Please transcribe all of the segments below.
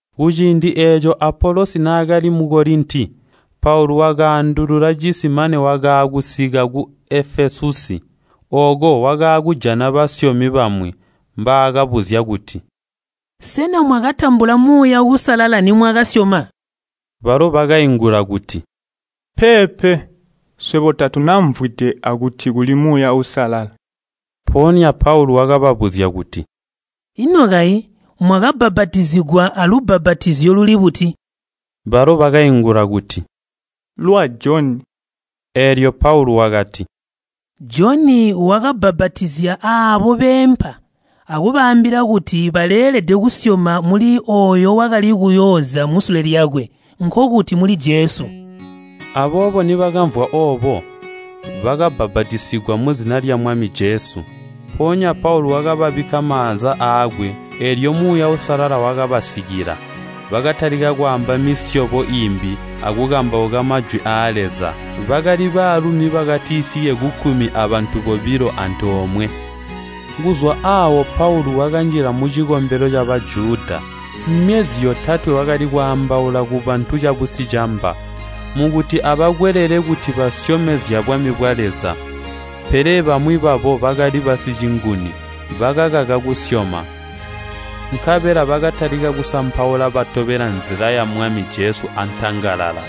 Kuciindi eeco Apolosi naakali mu Kolinti, Paulu wakaandulula cisi mane wakaakusika ku Efesusi. Ooko wakaakujana basyomi bamwi mbaakabuzya kuti, “Sena mwakatambula Muuya Uusalala nimwakasyoma?” Balo bakaingula kuti, “Peepe, swebo tatunamvwide akuti kuli Muuya Uusalala.” Mpoonya Paulu wakababuzya kuti, “Ino kayi mwakabbapatizigwa alubbapatizyo luli buti?” Balo bakaingula kuti, “Lwa Joni.” Eelyo Paulu wakati, “Joni wakabbapatizya aabo beempa akubaambila kuti baleelede kusyoma muli ooyo wakali kuyooza musule lyakwe, nkokuti muli Jesu.” Aboobo nibakamvwa oobo, bakabbapatizigwa muzina lya Mwami Jesu. Mpoonya Paulu wakababikka maanza aakwe, eelyo Muuya Uusalala wakabasikila, bakatalika kwaamba misyobo iimbi akukambauka Majwi aa Leza. Bakali baalumi bakatisike kukkumi abantu bobilo antoomwe. Kuzwa aawo Paulu wakanjila mucikombelo ca Bajuda. Myezi yotatwe wakali kwaambaula kubantu cabusicamba, mukuti abakwelele kuti basyome zyabwami bwa Leza. Pele bamwi babo bakali basicinguni, bakakaka kusyoma. Nkabela bakatalika kusampaula Nzila ya Leza antangalala.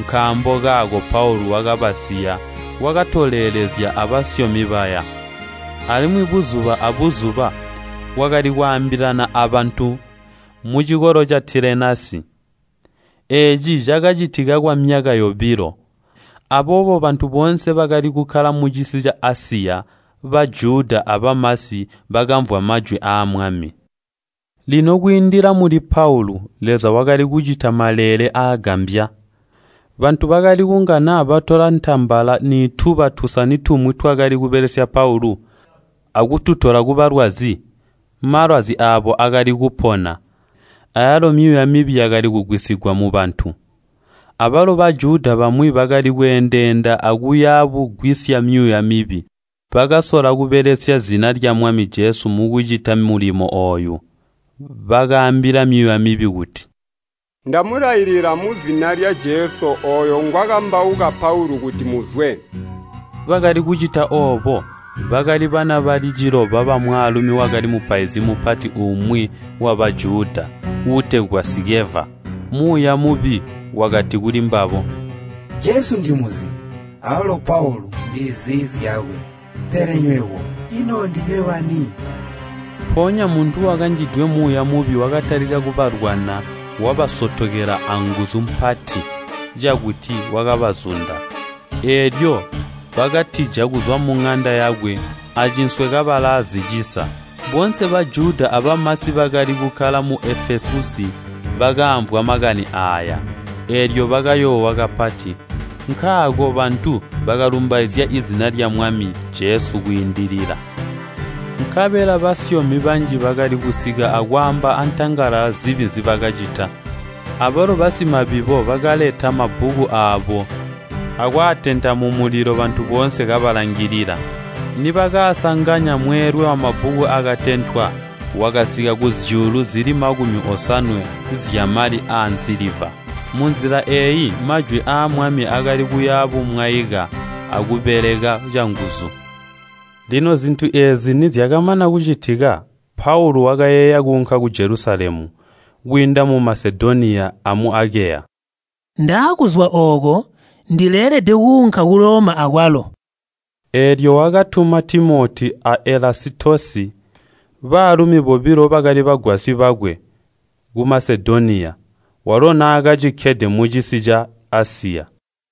Nkaambo kaako Paulu wakabasiya, wakatolelezya abasyomi baya. Alimwi buzuba abuzuba wakali kwaambilana abantu mucikolo ca Tilenasi. Eeci cakacitika kwamyaka yobilo, aboobo bantu boonse bakali kukkala mucisi ca Asiya, Bajuda abamasi, bakaamvwa Majwi aa Mwami. Lino kwiindila muli Paulu, Leza wakali kucita maleele aagambya. Bantu bakali kunga naa batola ntambala nituba tusani tumwi twakali kubelesya Paulu, akututola kubalwazi, malwazi aabo akali kupona, ayalo myuuya mibi yakali kugwisigwa mubantu. Abalo Bajuda bamwi bakali kweendeenda akuya bugwisya myuuya mibi, bakasola kubelesya zina lya Mwami Jesu mukucita mulimo ooyu. Bakaambila myuuya mibi kuti, “Ndamulailila muzina lya Jesu ooyo ngwakambauka Paulu kuti muzwe!” Bakali kucita oobo, bakali bana bali ciloba bamwaalumi wakali mupaizi mupati umwi wa Bajuda, uutegwa Sikeva. Muuya mubi wakati kulimbabo, “Jesu ndimuzi awalo Paulu ndizi zyakwe, pele nywebo, ino ndinywe bani?” Mpoonya muntu wakanjidwe muuya mubi wakatalika kubalwana wabasotokela anguzu mpati cakuti wakabazunda. Eelyo bakatija kuzwa muŋanda yakwe acinswe kabalaa zicisa. Boonse Bajuda abamasi bakali kukkala mu Efesusi bakaamvwa makani aaya, eelyo bakayoowa kapati. Nkaako bantu bakalumbaizya zina lya Mwami Jesu kwiindilila. Nkabela basyomi banji bakali kusika akwaamba antangalala zibi nzibakacita. Abalo basimabibo bakaleta mabbuku aabo akwaatenta mumulilo bantu boonse kabalangilila. Nibakasanganya mweelwe wamabbuku aakatentwa, wakasika kuzyuulu zili makumi osanwe zyamali aansiliva. Munzila eeyi Majwi aa Mwami akali kuya bumwaika akubeleka canguzu. Lino zintu eezi nizyakamana kucitika, Paulu wakayeeya kuunka ku Jelusalemu, kwiinda mu Masedoniya amu Akeya. Wakati, “Ndaakuzwa ooko, ndileelede kuunka ku Loma akwalo.” Eelyo wakatuma Timoti a Elasitosi, baalumi bobilo bakali bagwasyi bakwe, ku Masedoniya, walo naakacikkede mucisi ca Asiya.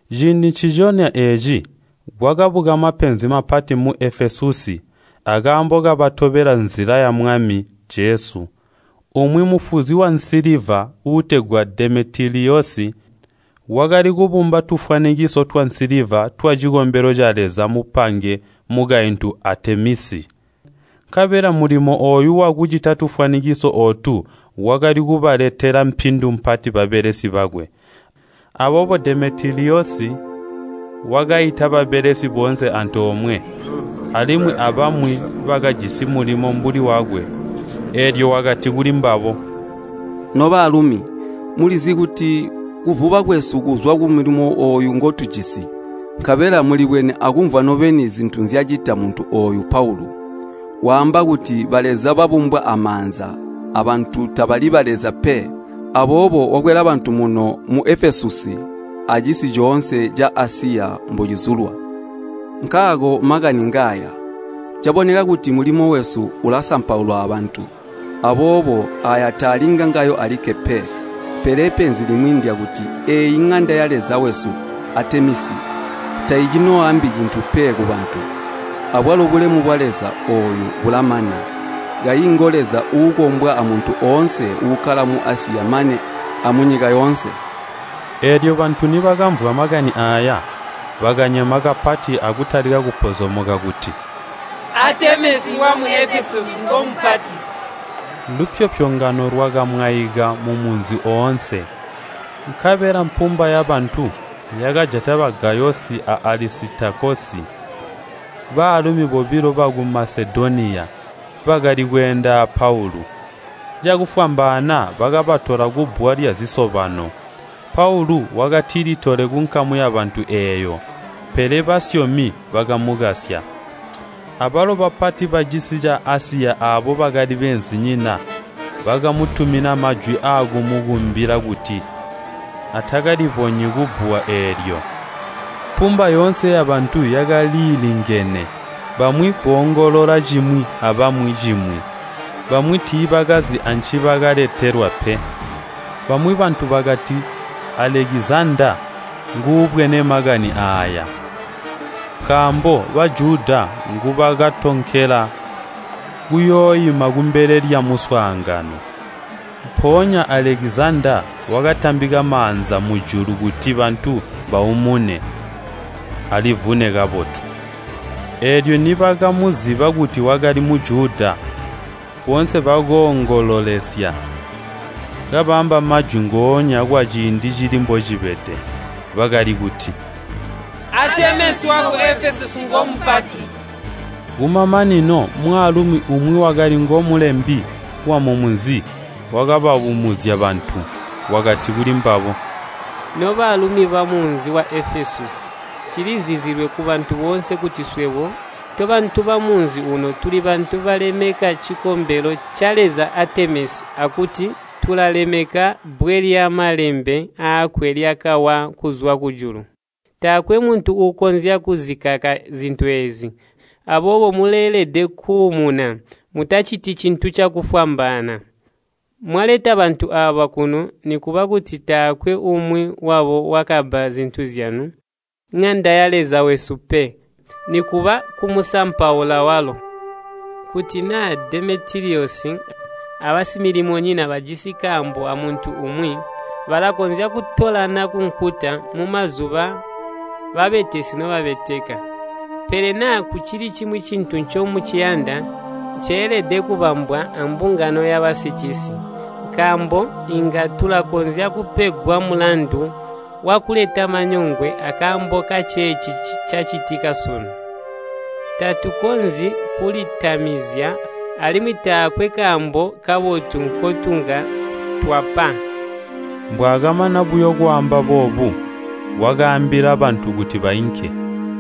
Ciindi nciconya eeci kwakabuka mapenzi mapati mu Efesusi akaambo ka Nzila ya Mwami. Umwi mufuzi wansiliva uutegwa Demetiliyosi, wakali kubumba tufwanikiso twansiliva twacikombelo caleza mupange mukaintu Aatemisi. Nkabela mulimo ooyu wakucita tufwanikiso ootu wakali kubaletela mpindu mpati babelesi bakwe. Aboobo Demetiliyosi wakaita babelesi boonse antoomwe, alimwi abamwi bakajisi mulimo mbuli wakwe, eelyo wakati kulimbabo, “Nobaalumi, mulizi kuti kuvuba kwesu kuzwa kumulimo ooyu ngotujisi. Nkabela mulibwene akumvwa nobeni zintu nzyacita muntu ooyu Paulu. Waamba kuti baleza babumbwa amaanza aabantu tabali baleza pe. Aboobo wakwela bantu muno mu Efesusi acisi coonse ca Asiya mbocizulwa. Nkaako makani ngaaya. Caboneka kuti mulimo wesu ulasampaulwa abantu. Aboobo aaya taali ngangawo alikke pe, pele penzi limwi ndyakuti eeyi Ŋanda ya Leza wesu Aatemisi taicinooambi cintu pe kubantu. Abwalo bulemu bwaleza ooyu bulamana, kayi ngo leza uukombwa amuntu oonse uukkala mu Asiya mane amunyika yoonse!” Eelyo bantu nibakamvwa makani aaya, bakanyema kapati akutalika kupozomoka kuti, “Aatemisi wamu Efesusi ngomupati!” Lupyopyongano lwakamwaika mumunzi oonse. Nkabela mpumba yabantu yakajata ba Gayosi a Alisitakosi, baalumi bobilo baku Masedoniya, bakali kweenda a Paulu. Cakufwambaana, bakabatola kubbuwa lyazisobano. Paulu wakatilitole kunkamu yabantu eeyo, pele basyomi bakamukasya. Abalo bapati bacisi ca Asiya aabo bakali beenzinyina, bakamutumina majwi aakumukumbila kuti atakalibonyi kubbuwa eelyo. Mpumba yoonse yabantu yakaliilingene. Bamwi boongolola cimwi abamwi cimwi. Bamwi tiibakazi ancibakeetelwa pe. Bamwi bantu bakati Alekizandaa nguubwene makani aaya, nkaambo Bajuda ngubakatonkela kuyooima kumbele lyamuswaangano. Mpoonya Alekizandaa wakatambika maanza mujulu kuti bantu baumune, alivune kabotu. Eelyo nibakamuziba kuti wakali Mujuda, boonse bakoongololesya, kabaamba majwi ngoonya kwaciindi cili mbocibede. Bakali kuti, “Aatemisi waku Efesusi ngomupati!” Kumamanino mwaalumi umwi wakali ngomulembi wamumunzi wakabaumuzya bantu. Wakati kulimbabo, “Nobaalumi bamunzi wa Efesusi, cilizizilwe kubantu boonse kuti swebo tobantu bamunzi uuno tuli bantu balemeka cikombelo caleza Aatemisi, akuti tulalemeka bbwe lyamalembe aakwe lyakawa kuzwa kujulu. Taakwe muntu uukonzya kuzikaka zintu eezi, aboobo muleelede kuumuna, mutaciti cintu cakufwambaana. Mwaleta bantu aaba kuno nikuba kuti taakwe umwi wabo wakabba zintu zyamuŋanda yaleza wesu pe, nikuba kumusampaula walo. Kuti naa Demetiliyosi abasimilimonyina bajisi kaambo amuntu umwi, balakonzya kutolana kunkuta mumazuba babetesi nobabeteka. Pele naa kucili cimwi cintu ncomuciyanda, ceelede kubambwa ambungano yabasicisi. Nkaambo inga tulakonzya kupegwa mulandu wakuleta manyongwe akaambo kaceeci cacitika sunu. Tatukonzyi kulitamizya, alimwi taakwe kaambo kabotu nkotunga twapa.” Mbwaakamana buyo kwaamba boobu, wakaambila bantu kuti baunke.